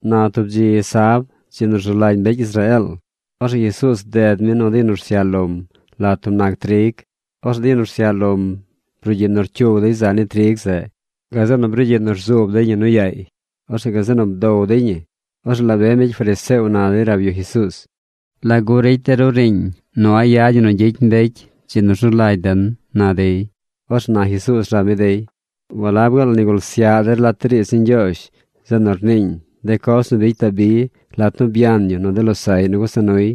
Na tub dzi sab, dzi nu rzu lagy mbecy Israeel, orzeꞌ Jesuuz bded mi nu de yu nu rsyaꞌ lom lat tub nac trig. Orzeꞌ de yu nu rsyaꞌ lom brugyiꞌ nu rcyug dey zaꞌ ni trig zeꞌ. Gazeꞌ nu brugyiꞌ nu rzuub dey ñi nu yaay. Orzeꞌ gazeꞌ nu bdow dey ñi. Orzeꞌ la be mbecy fariseo na dey rab yu Jesuuz: ―¿Lagu ricy de ru riiñ nu a̱ꞌ yad ñi nu gyicy mbecy dzi nu rzu lagy den? ―na dey. Orzeꞌ na Jesuuz rab mi dey: ―¿Walab gaal nigul syaꞌ der lat de riidz ni Ñgyoozh zeꞌ nu rniiñ de coz nu bicy Dabi lat nu byan yu nu de losaꞌy nu gusa nuy?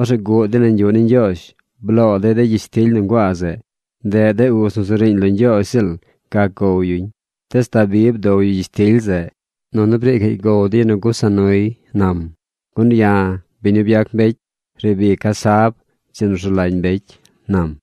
Orzeꞌ guꞌ dey nañ yuꞌ ni Ñgyoozh. Bloo dey de gyishtily nu nguaa zeꞌ. Ndeꞌ de uz nu zu riiñ lo Ñgyoozh ziꞌl gac gow yuñ. Tees Dabi bdow yu gyishtily zeꞌ, nunu briicaꞌy gow de yu nu gusa nuy ―nam―. Gun ya̱, biñ nu byac mbecy, riib ica̱ sab, dzi nu rzu lagy mbecy ―nam.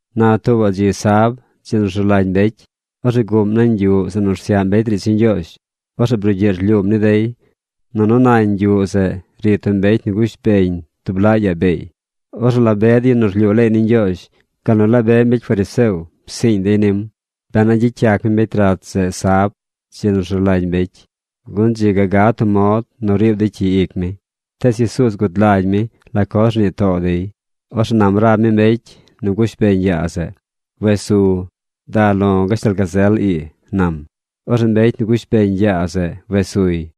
Na tuubaꞌ dzi sab, dzi nu rzu lagy mbecy, orzeꞌ guꞌm nañ yuꞌ zeꞌ nu rsyaꞌ mbecy riidz ni Ñgyoozh. Orzeꞌ brugyiꞌ rlyuum ni dey, nunu nañ yuꞌ zeꞌ ri tub mbecy nu gush beñ tub laꞌ yaa beey. Orzeꞌ la be de yu nu rlyuu leey ni Ñgyoozh, gal nu la be mbecy fariseo psiiñ dey nim, ben a gyicy yac mi mbecy rat zeꞌ sab, dzi nu rzu lagy mbecy, gun dzi ga gad tub mod nu riib dey cyi ic mi. Tees Jesuuz gud lagy mi la coz rnii too dey. Orzeꞌ nam rab mi mbecy nu gush beñ yaa zeꞌ: ―Wes su. Da lo̱ gashtal gazel ii ―nam. Orzeꞌ mbecy nu gush beñ yaa zeꞌ wes suy.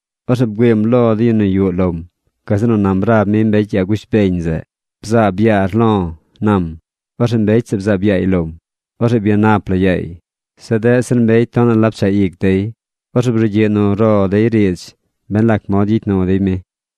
Orzeꞌ bgüiim lo de yu nu yuꞌ lom. Gazeꞌ nu nam rab mi mbecy yaa gush beñ zeꞌ: ―Bzaab yaar lo̱ ―nam. Orzeꞌ mbecy zeꞌ bzaab yaay lom. Orzeꞌ byanap la yaay. Zeꞌ deꞌ zir de mbecy tonaꞌ la pchaꞌ ic dey. Orzeꞌ brugyiꞌ nu ro dey riidz ben lac mod gyicy nu dey mi.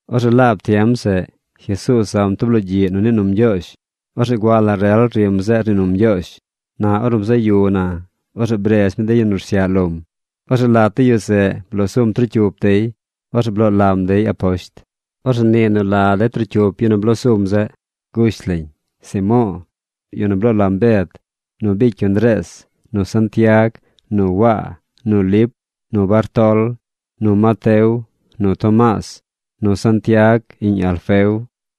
Orzeꞌ laab tiem zeꞌ Jesuuz zam tub logyiꞌ nu nii num Ñgyoozh. Orzeꞌ gua la rel nu rim zeꞌ rnii num Ñgyoozh. Na ornu bzaꞌ yu na, orzeꞌ bredz mi de yu nu rsyaꞌ lom. Orzeꞌ lat de yu zeꞌ bloo sum trocyup dey. Orzeꞌ bloo lam dey aposht. Orzeꞌ nii nu la de trocyup de yu nu bloo sum zeꞌ. Gush lañ: Simo̱o̱, yu nu bloo lam Bed, nu bicy yu Ndrees, nu Santiag, nu Waa, nu Lip, nu Bartol, nu Mateo, nu Tomaas, nu Santiag, iꞌñ Alfeo,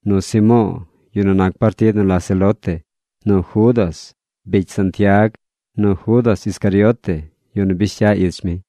nu Simo̱o̱, yu nu nac partid nu la celote, nu Judas, bicy Santiag, nu Judas Iscariote, yu nu bish cya ich mi.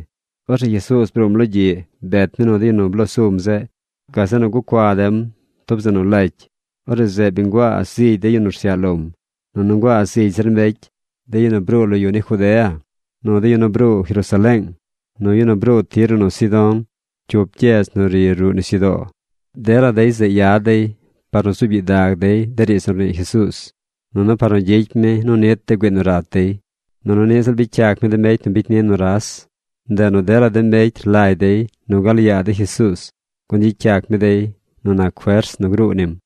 Orzeꞌ Jesuuz bruum logyiꞌ bet mi nu de yu nu bloo sum zeꞌ. Gazeꞌ nu gucua dem tub zeꞌ nu lacy. Orzeꞌ zeꞌ bi nguaa zigy de yu nu rsyaꞌ lom. Nunu nguaa zigy zir mbecy, de yu nu bruu lo yu ni Judea, nu de yu nu bruu Jerusaleeng, nu yu nu bruu Tiro nu Sidón, cyup gyedz nu ri ruꞌ nisyudoo. Dela dey zeꞌ yad dey par nu zuub gyidag dey de riidz nu rnii Jesuuz, nunu par nu gyicy mi nu nit de güii nu rat dey. Nunu niꞌ ziꞌl bicy yac mi de mbecy nu bicy ni nuras. Ndeꞌ nu dela de mbecy rlagy dey nu gal yaa dey Jesuuz, gun gyicy yac mi dey nu nac fers nu gruu nim.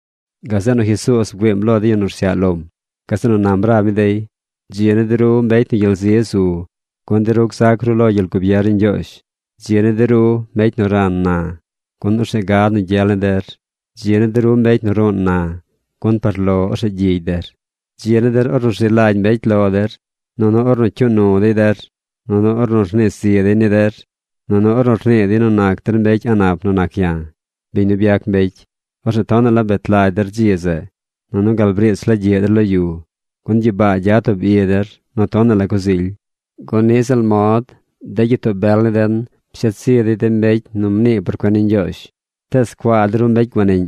Gazeꞌ nu Jesuuz bgüiim lo de yu nu rsyaꞌ lom. Gazeꞌ nu nam rab mi dey: ―Dzi ni de ru mbecy nu gyel zi zu, gun de ru gzac ru lo gyel gubier ni Ñgyoozh. ’Dzi ni de ru mbecy nu ran na, gun orzeꞌ gad nu gyel ni der. ’Dzi ni de ru mbecy nu ruun na, gun par lo orzeꞌ gyigy der. ’Dzi ni der ornu rzi lagy mbecy lo der, nunu ornu cyuu nu dey der, nunu ornu rnii zi dey ni der, nunu ornu rnii dey nu nac der mbecy a̱ꞌ nap nu nac ya̱, biñ nu byac mbecy. Orzeꞌ tonaꞌ la bet lagy der dzi zeꞌ, nunu gal briich la gyiꞌ der lo yu, gun gyibaa gyad tub i der nu tonaꞌ la coz ily, gun niꞌ ziꞌl mod de gyitoo bel ni den pshet zi dey de mbecy nu rnii por cuen ni Ñgyoozh. ’¡Tees cuaa de ru mbecy guaniꞌñ,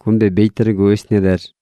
gun bi bicy der gusht ni der!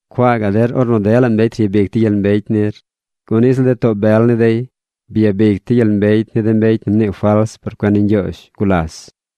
’¡Cuaa gaꞌ der ornu dela mbecy ryabic dey gyel mbecy nir, gun niꞌ ziꞌl de too bel ni dey byabic dey gyel mbecy ni de mbecy nu mnii fals por cuen ni Ñgyoozh gulas!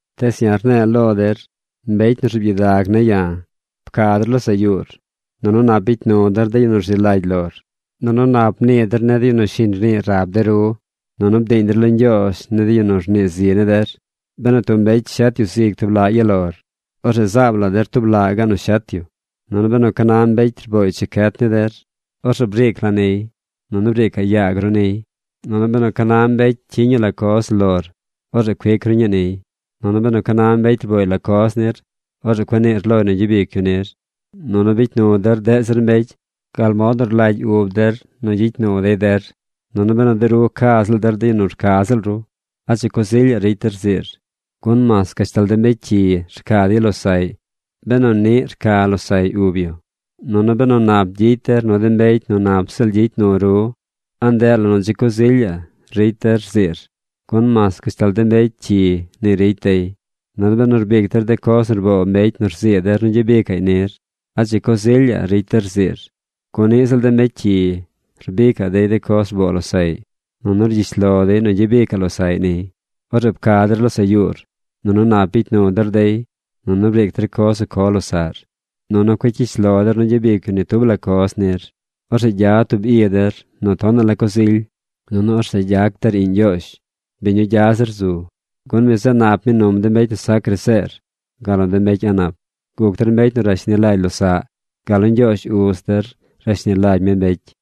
’Tees ya̱ rne̱e̱ lo der mbecy nu rzuub gyidag ne̱ ya̱: Pca der losaꞌ yuur, nunu nap bicy nu der de yu nu rzi lagy lor. Nunu nap mnii der ni de yu nu shiñ rnii rab de ru. Nunu bdiiñ der lo Ñgyoozh ni de yu nu rnii zi ni der. Benu tub mbecy shet yu zig tub laꞌ ya lor, orzeꞌ zaabaꞌ der tub laꞌ gaꞌ loy nu shet yu. Nunu benu ca na mbecy rbooy chicyet ni der, orzeꞌ briic la niy, nunu briicaꞌ yaag ru niy. Nunu benu ca na mbecy cyiñ yu la coz lor, orzeꞌ cuic ru ñii niy. Nunu benu ca na mbecy rbooy la coz nir, orzeꞌ cueꞌ niir loy nu gyabic yu nir. Nunu bicy nu der deꞌ zir mbecy gal mod nu rlagy ub der nu gyicy nu dey der. ’Nunu benu de ru ca ziꞌl der de yu nu rca ziꞌl ru, ¿a dzi coz ilyaꞌ ricy der rziir? Gun mas gashtal de mbecy cyi rca dey losaꞌy benu niꞌ rca losaꞌy ub yu. Nunu benu nap gyicy der nu de mbecy nu nap ziꞌl gyicy nu ru, ¿a ndeꞌ la nu dzi coz ilyaꞌ ricy der, rziir? Gun mas gashtal de mbecy cyi ni ricy dey. Nunu benu rbic der de coz nu rboo mbecy nu rzii der nu gyabicaꞌy nir, ¿a dzi coz ilyaꞌ ricy der rziir? Gun niꞌ ziꞌl de mbecy cyi rbicaꞌ dey de coz rboo losaꞌy. Nunu rgyish lo dey nu gyabicaꞌ losaꞌy niy. Orzeꞌ pca der losaꞌ yuur, nunu nap bicy nu der dey, nunu briic der coz nu co losaꞌr. Nunu cueꞌ cyish lo der nu gyabic yu ni tub la coz nir. Orzeꞌ gyad tub i der nu tonaꞌ la coz ily. Nunu orzeꞌ gyac der iꞌñ Ñgyoozh, biñ nu gya zir zu. Gun mi zeꞌ nap mi num de mbecy nu sac graseer, gal nu de mbecy a̱ꞌ nap. Guc der mbecy nu rashni lagy losaꞌ, gal nu Ñgyoozh uz der rashni lagy mi mbecy.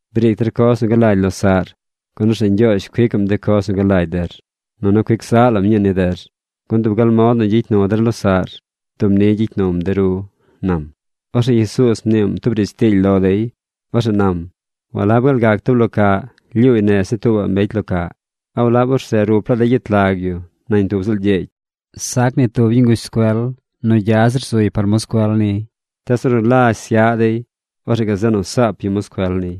Briic der coz nu galagy losaꞌr, gun orzeꞌ Ñgyoozh cuicaꞌm de coz nu galagy der. Nunu cuic zaꞌ lam ñii ni der. Gun dub gal nu gyicy nu der losaꞌr, dub ni gyicy num de ru ―nam. Orzeꞌ Jesuuz mniim tub riidz tiily lo dey. Orzeꞌ nam: ―¿Walab gaal gac tub lo caꞌ lyuuy nez ni tuubaꞌ mbecy lo caꞌ? ¿A walab orzeꞌ rup laa dey gyet lag yu nañ tub ziꞌl gyeegy? Sac ni tub yu nguzh scuel nu zily zir nac yu par moscuel niy. Tees ornu lazh syaꞌ dey, orzeꞌ gazeꞌ nu saap yu moscuel niy.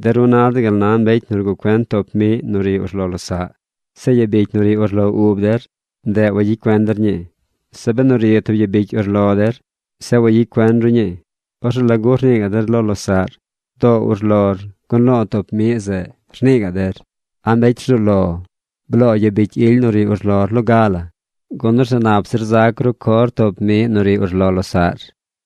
’De ru na der gal na mbecy nu rguꞌ cuen toop miꞌ nu ri urlo losaꞌ, zeꞌ yabicy nu ri urlo ub der, ndeꞌ wagyicy cuen der ñii. Zeꞌ benu ri tub yabicy urlo der, zeꞌ wayicy cuen ru ñii, ¿orzeꞌ lagu rnii gaꞌ der lo losaꞌr: “Doo urlor, gun lo̱o̱ toop miꞌ zeꞌ”, rnii gaꞌ der? ¡A mbecy rzuu lo! Bloo yabicy ily nu ri urlor loga la, gun orzeꞌ nap zir zac ru cor toop miꞌ nu ri urlo losaꞌr.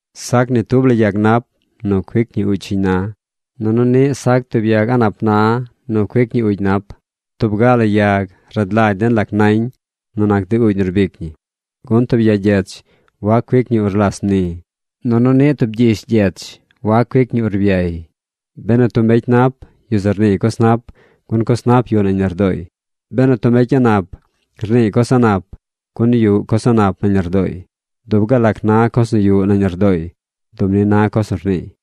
’Sac ni tub la yag nap nu cuic ñi uugy shiñ na, nunu niꞌ sac tub yag a̱ꞌ nap na nu cuic ñi uugy nap. Tub ga la yag rad lagy den la nañ nu nac de uugy nu rbic ñi, gun tub ya gyech wac cuic ñi urlas mni. Nunu niꞌ tub gyish gyech wac cuic ñi urbyay. Benu tub mbecy nap, yu zeꞌ rniiy coz nap, gun coz nap yuꞌ nañ lardooy. Benu tub mbecy a̱ꞌ nap, rniiy coz a̱ꞌ nap, gun yuꞌ coz a̱ꞌ nap nañ lardooy. Dub gal lac na coz nu yuꞌ nañ lardooy dub ni na coz nu rniiy.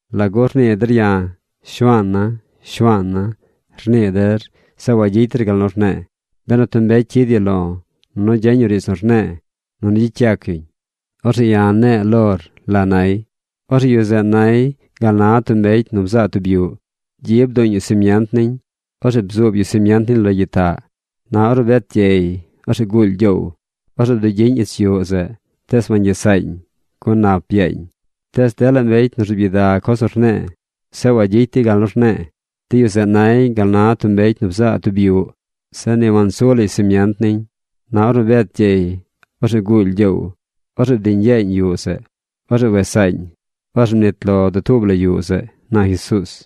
’¿Lagu rnii der ya̱, “Shuaana̱, Shuaana̱”, rnii der zeꞌ wagyicy der gal nu rne̱e̱? Benu tub mbecy cyid yu lo̱, nunu gyeñ yu riidz nu rne̱e̱, nunu gyicy yac yuñ, orzeꞌ ya̱ rne̱e̱ lor la nay. Orzeꞌ yu zeꞌ nay gal na tub mbecy nu bzaa tub yuꞌ. Gyi bduuñ yu simient niñ. Orzeꞌ bzuub yu simient niñ lo gyitaꞌ. Na ornu bet gyey, orzeꞌ guuly gyoow. Orzeꞌ bdugyiñ ich yuꞌ zeꞌ. Tees wangyes saañ, gun nap byaañ. Tees dela mbecy nu rzuub gyidag coz nu rne̱e̱, zeꞌ wayicy dey gal nu rne̱e̱, de yu zeꞌ nay gal na tub mbecy nu bzaa tub yuꞌ. Zeꞌ ni wansu lay simient niñ. Na ornu bet gyey, orzeꞌ guuly gyoow. Orzeꞌ bdiñ yeeñ yuꞌ zeꞌ. Orzeꞌ wes saañ. Orzeꞌ mnit lo dutuub la yuꞌ zeꞌ ―na Jesuuz.